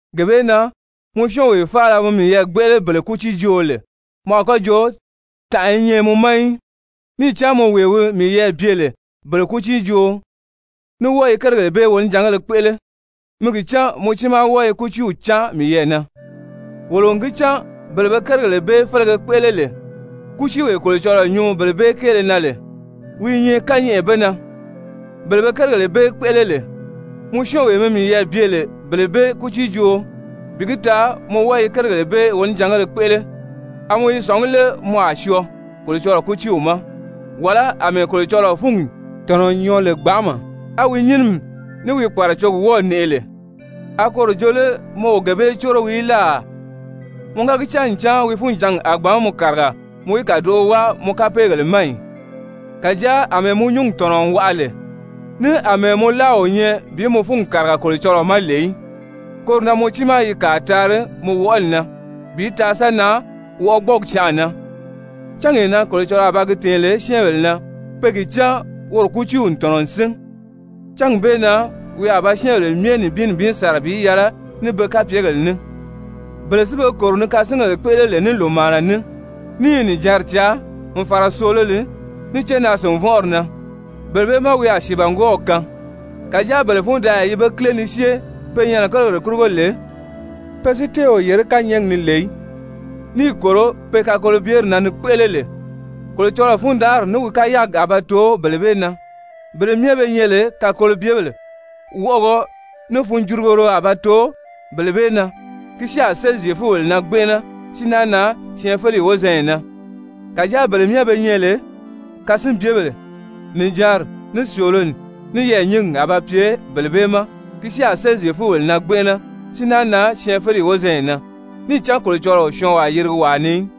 Gee bee na mɔ syɔ́ɔnwee faala mi miyɛɛ gbéʔele bele kútiijooo lè, mɔ a kɔ́ joo tànʔa i nyɛ mɔ ma í, níì cán mɔ wee mi miyɛɛ bye lè bele kútiijooo ní wɔ́ɔ i kérigèle bee wonijangéle kpéʔele, mi gi cán mɔ tiimaa wɔ́ɔ i kútiiw cáan miyɛɛ na. Wolo n gi cán bele be kérigèle bee félege kpéʔele lè, kútiiwee Kolocɔlɔɔ nyuu bele bee kéele na lè, wi i nyɛ kányɛʔɛ be na. Bele be kérigèle bee kpéʔele lè, mɔ syɔ́ɔnwee mi miyɛɛ bye lè bele bee kútiijooo, bi gi taa mɔ wɔ́ɔ i kérigèle bee wonijangéle kpéʔele, a mɔ i sɔ̀ngí lé mɔ a syɔɔ Kolocɔlɔɔ kútiiw ma? Wàlá àmɛɛ Kolocɔlɔɔ fúngi tɔ̀nɔ n nyɔɔ lè gbanʔama, á wi nyínimi ní wi kpàracogi wɔ́ɔ̀ nɛʔɛ lè, a koro jo lé mɔ o gee bee córo wii í láà? Mɔ ga gi cán ncan wi funjǎngi a gbǎn mɔ kàriga mɔ í kàdoʔo wáa mɔ kapeegèle ma ì? Kàjáa àmɛɛ mɔ nyúngi tɔ̀nɔ n waʔa lè, ní àmɛɛ mɔ láa o nyɛ bi mɔ fúngi kàriga Kolocɔlɔɔ ma lè í, koro na mɔ tiimaa i kàa taari mɔ wɔʔɔli na bi taa sa nan wɔʔɔgbɔɔgi canʔa na, cángee na Kolocɔlɔɔ a ba gi tɛ̀ɛn lè syɛ́ɛnbèle na pe gi cán woro kútiiw n tɔ̀nɔ n sín. Cángi bee na wi a ba syɛ́ɛnbèle myɛ nibin nibin sàra bi yɛlɛ ní be kapyegèle ní. Bele si be kòro ni kasingèle kpéʔele lè ní lòmaana ní, ní i nìjanri caa, n fàra sòololi, ní cénaa-sìnvɔnʔɔri na, bele bee má wi a sìibangwɔɔw kaan. Kàjáa bele fundaaya yi be kíle ni syée pe nyɛnɛ kérigèle kurugo lè, pe si tée o yèré kányɛɛgi ni lè í, níì kòro pe kakolobyeri na ni kpéʔele lè, Kolocɔlɔɔ fundanʔari ní wi kayaagi a ba too bele bee na. Bele myɛ be nyɛ lè kakolobyebèle, wɔʔɔgɔ ní funjurugoro a ba too bele bee na, ki si a séli Zyefubèle na gbɛnʔɛnɛ, si náa nan syɛɛnfeleyi wozanya na. Kàjáa bele myɛ be nyɛ lè kasinbyebèle, nìjanri, ní sòololi, ní yɛɛ̀nyingi a ba pye bele bee ma, ki si a séli Zyefubèle na gbɛnʔɛnɛ, si naa nan syɛɛnfeleyi wozanya na. Níì cán Kolocɔlɔɔ o syɔɔnwaa yirigi wàa ni í.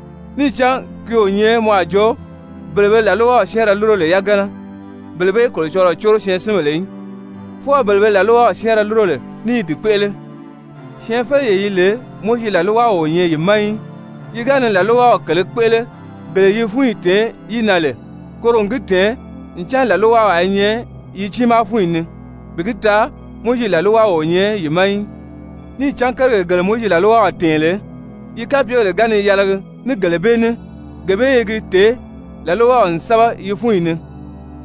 Níì cán ki o nyɛ mɔ a jo bele be làlwaw syɛ́ɛnrɛ lúro lè yagana, bele bee Kolocɔlɔɔ córo syɛɛnsinbèle í, fwɔɔ bele be làlwaw syɛ́ɛnrɛ lúro lè ní i di kpéʔele. Syɛɛnfeleyee yi lè Mowizi làlwaw o nyɛ yi ma í, yi ga ni làlwaw kèlē kpéʔele gele yi fúnyi tèé yi na lè, koro n gi tɛ̀ɛn ncan làlwawaa i nyɛ yi tiimaa fúnyi ni, bi gi taa Mowizi làlwaw o nyɛ yi ma í. Níì cán kérigèle gele Mowizi làlwaw tɛ̀ɛn lè, yi kapyegèle ga ni yɛlɛgi ní gele bee ní, gee bee i gi tèé làlwaw n sɛ́bɛ yi fúnyi ni.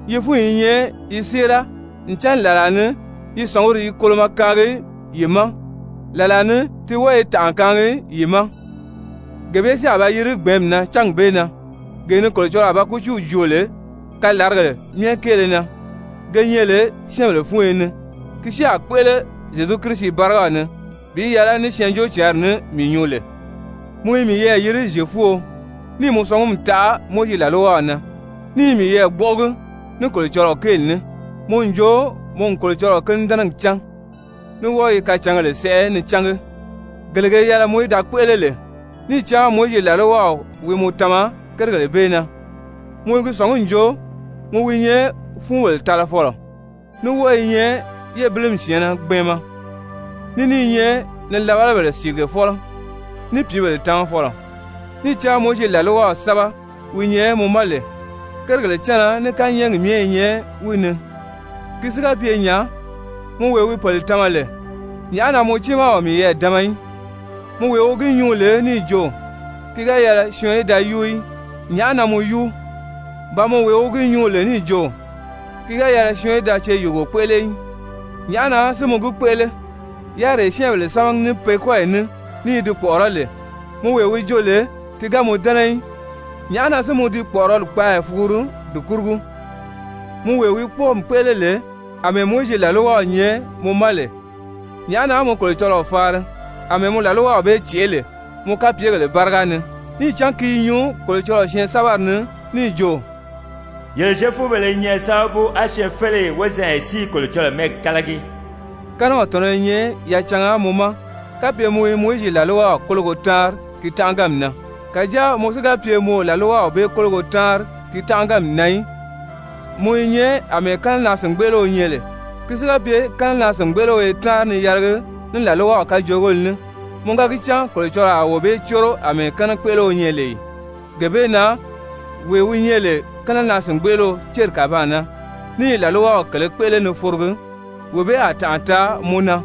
Yi fúnyi i nyɛ yi séera, ncan làlaa ni yi sɔ̀nguri i kolomɔ kaangi yi ma, làlaa ni ti wɔ́ɔ i tànʔa kaangi yi ma. Gee bee si a ba yiri gbɛ̀ɛ́nmi na cángi bee na, gee ni Kolocɔlɔɔ a ba kútiiw joo lè kalaragèle myɛ kéele na ge nyɛ lè syɛ́ɛnbèle fúnyo ni, ki si a kpéʔele Zyezu Kirisi bárigaw ni bi yɛlɛ ní Syɛɛnjóocǎnri ní mii nyuu lè. Mɔ i miyɛɛ yiri Zyefuo, níì mɔ sɔngumi taʔa Mowizi làlwaw na, ní i miyɛɛ gbɔ́ʔɔgi ní Kolocɔlɔɔ kéeli ní, mɔ n jo mɔ n Kolocɔlɔɔ kínidɛnɛgi cán, ní wɔ́ɔ i kacǎngèle sɛʔɛ ni cángi, gele ge yɛlɛ mɔ í da kpéʔele lè, níì cán Mowizi làlwaw wi mɔ tama kérigèle bee na, mɔ i gi sɔ̀ngí n jo mɔ wi nyɛ fúunbèle talafɔlɔ, ní wɔ́ɔ i nyɛ yébilimi syɛ̀ɛnnɛ gbɛɛnmɛ, ní ní i nyɛ nilabalabèle cìligefɔlɔ ní pìíbèle tamafɔlɔ, níì cán Mowizi làlwaw sɛ́bɛ wi nyɛ mɔ ma lè, kérigèle cánna ní kányɛɛgi myɛ i nyɛ wi ni. Ki si ga pye nya, mɔ wee wi pèle tama lè, nyàʔá na mɔ tiimaa o miyɛɛ dama í? Mɔ wee wi gi nyuu lè níì jo: Ki ga yɛlɛ syɔɔn í da yúu í, nyàʔá na mɔ yúu? Ba mɔ wee wi gi nyuu lè níì jo: Ki ga yɛlɛ syɔɔn í da ceyuugo kpéʔele í, nyàʔá na si mɔ gi kpéʔele? Yáriree syɛ́ɛnbèle sámagi ní pe kɔ́yi ní ní i di kpɔ̀ʔɔrɔ́ lè, mɔ wee wi jo lè ti ga mɔ dɛ́nɛ í, nyàʔá na si mɔ di kpɔ̀ʔɔrɔli kpaaya fuguru di kurugo? Mɔ wee wi kpɔ́ɔmi kpéʔele lè àmɛɛ Mowizi làlwaw nyɛ mɔ ma lè, nyàʔá na mɔ Kolocɔlɔɔ faari àmɛɛ mɔ làlwaw bee cèʔé lè mɔ kapyegèle báriga ni? Níì cán ki i nyuu Kolocɔlɔɔ syɛɛnsɛbɛri ni níì jo: «Yele Zyefubèle i nyɛ sábabu á syɛɛnfeleyi wozanya si i Kolocɔlɔɔ mɛ́ɛgi kálagi.» Kɛ́nɛw tɔ̀nɔ́ i nyɛ yacanga mɔ ma kapye mɔ i Mowizi làlwaw kólogo táanri ki tánʔaganmi na. Kàjáa mɔ si ga pye mɔ o làlwaw bee kólogo táanri ki tánʔaganmi na í, mɔ i nyɛ àmɛɛ kɛ́nɛnaa-sìngbeʔeleo nyɛ lè. Ki si ga pye kɛ́nɛnaa-sìngbeʔeleo i táanri ni yɛlɛgi ní làlwaw kajoogéle ní, mɔ ga gi cán Kolocɔlɔɔ a wee bee córo àmɛɛ kɛ́nɛkpeʔeleo nyɛ lè ì? Gee bee na wee wi nyɛ lè kɛ́nɛnaa-sìngbeʔeleo céri kàbaan na ní i làlwaw kèlē kpéʔele ni forogi, wee bee a tànʔa taa mɔ na,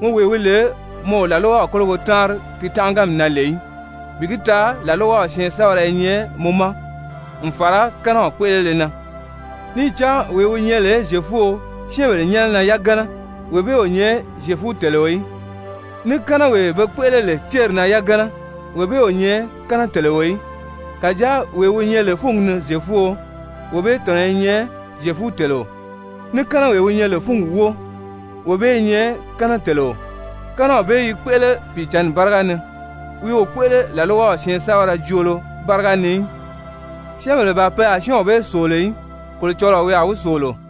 mɔ wee wi lè mɔ o làlwaw kólogo táanri ki tánʔaganmi na lè í, bi gi taa làlwaw syɛɛnsɛbɛrɛ i nyɛ mɔ ma n fàra kɛ́nɛw kpéʔelele na. Níì cán wee wi nyɛ lè Zyefuo syɛ́ɛnbèle nyɛ́nɛ na yagana, wee bee o nyɛ Zyefuteleo í. Ní kɛ́nɛwee be kpéʔele lè céri na yagana, wee bee o nyɛ kɛ́nɛteleo í. Kàjáa wee wi nyɛ lè fúngi ni Zyefuo, wee bee tɔ̀nɔ́ i nyɛ Zyefuteleo. Ní kɛ́nɛwee wi nyɛ lè fúngi wóo, wee bee i nyɛ kɛ́nɛteleo, kɛ́nɛw bee i kpéʔele Pìicǎnni báriga ni, wi o kpéʔele làlwaw syɛɛnsɛbɛrɛ joolo báriga ni í. Syɛ́ɛnbèle ban pe a syɔ́ɔnw bee sòolo í, Kolocɔlɔɔ wi a wi sòolo.